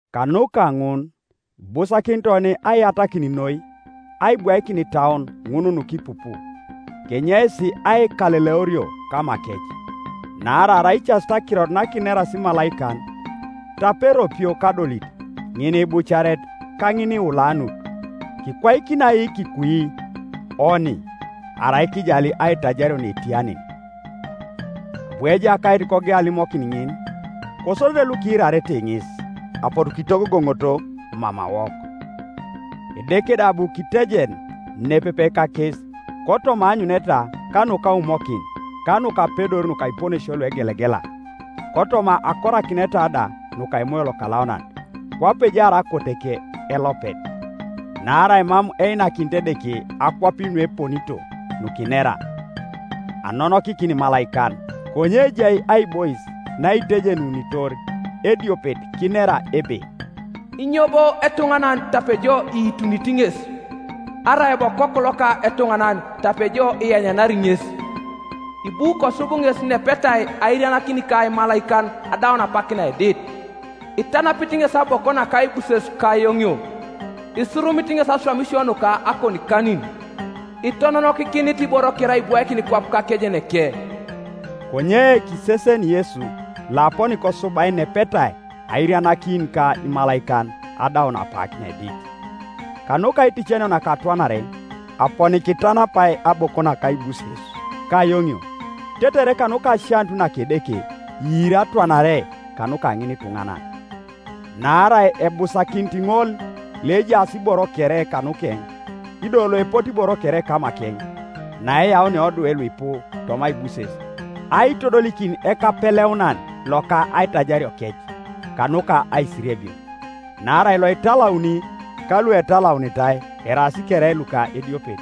Kanuka ŋun ibusakinit oni aiyatakin noi aibwaikin itauon ŋun nukipupu, kenyeis aikaleleorio kamakec. Naarai arai icasit akirot nakineras imalaikan, tape eropio kadolit ŋiniibucaret ka ŋiniiulanut, kikwaikini ai kikui oni arai kijali aitajario naetia nen? Abu Ejakait kogeu alimokin ŋin, kosodete lukiirarete ŋes apotu kitogogoŋoto mamawok. Edeke da abu kitejen nepepe kakes kotoma aanyuneta ka nukaumokin, ka nukapedor nuka iponesio luegelegela, kotoma akorakineta da nuka Emoyo Lokalaunan, kwape ejaar akoteke elopet. Naarai mam einakinit Edeke akwapin nueponito nukinera, anonokikin imalaikan. Konye ejai aibois naitejenunitor ediopet, kinera ebe, “Inyo bo etuŋanan, tape jo iitunit ŋes? Arai bo okoku loka etuŋanan, tape jo ianyanari ŋes? Ibu kosub ŋes nepetai airianakin ka imalaikan adaun apak naedit, Itanapit ŋes aboko naka aibuses ka ayoŋio, Isurumit ŋes aswamisio nuka akonikanin. Itononokikinit iboro kere aibwaikin kwap kakejeneke.” Konye kiseseni Yesu loaponi kosubai nepetai airianakin ka imalaikan adaun apak naedit, kanuka aiticanio naka atwanare, aponi kitanapai aboko naka aibuses ka ayoŋio, tetere kanuka asianut naka Edeke, iiri atwanare kanuka ŋinituŋanan. Naarai ebusakinit ŋol, loejaas iboro kere kanukeŋ, ido loepote iboro kere kamakeŋ, naeyaunia odwe luipu toma aibuses, aitodolikin ekapeleunan loka aitajariokec kanuka aisiriebio. Naarai loitalauni ka luetalaunitai eraas kere luka ediopet.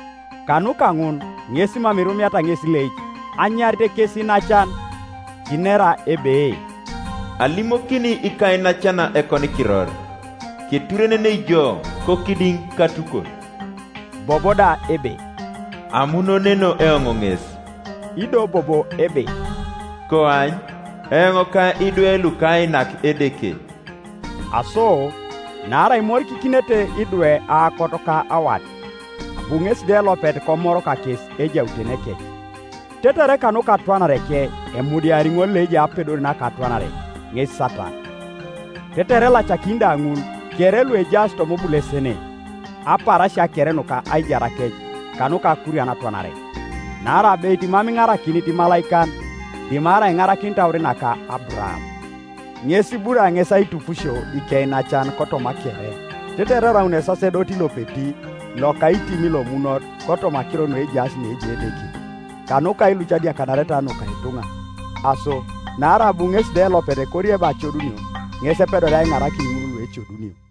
Kanuka ŋun ŋes mam irumiata ŋes ileic anyarit kes iinacan, kinera ebe, “Alimokini ikainacan ekonikiror, Keturenenei jo, kokidiŋ katukot.” Bobo da ebe, “Amunoneno eoŋ ŋes.” Ido bobo ebe, “Koany, eoŋ ka idwe lukainak Edeke.” Aso naarai imorikikinete idwe aokot ka awat, abu ŋesi da elopet komor kakes ejautenekec, tetere kanuka atwanareke emudiari ŋol loejai apedor naka atwanare, ŋes Satan. Tetere elacakini da ŋul kere lukejaas toma obulesene apaarasia kere nuka aijarakec, kanuka akurian atwanare. Naarai abeit mam iŋarakinit imalaikan, dimarai iŋarakinit aur naka Aburaam. Ŋes iburaa ŋes aitupusio ikeinacan kotoma kere, tetere eraun esasedoti lopeti lokaitim lomunot kotoma akiro nuejaas neejai Edeke, kanuka ailuc adiakanareta nuka ituŋa. Aso naarai abu ŋesi da elopet korieba ecodunio, ŋes epedoria aiŋarakin ŋul luecodunio.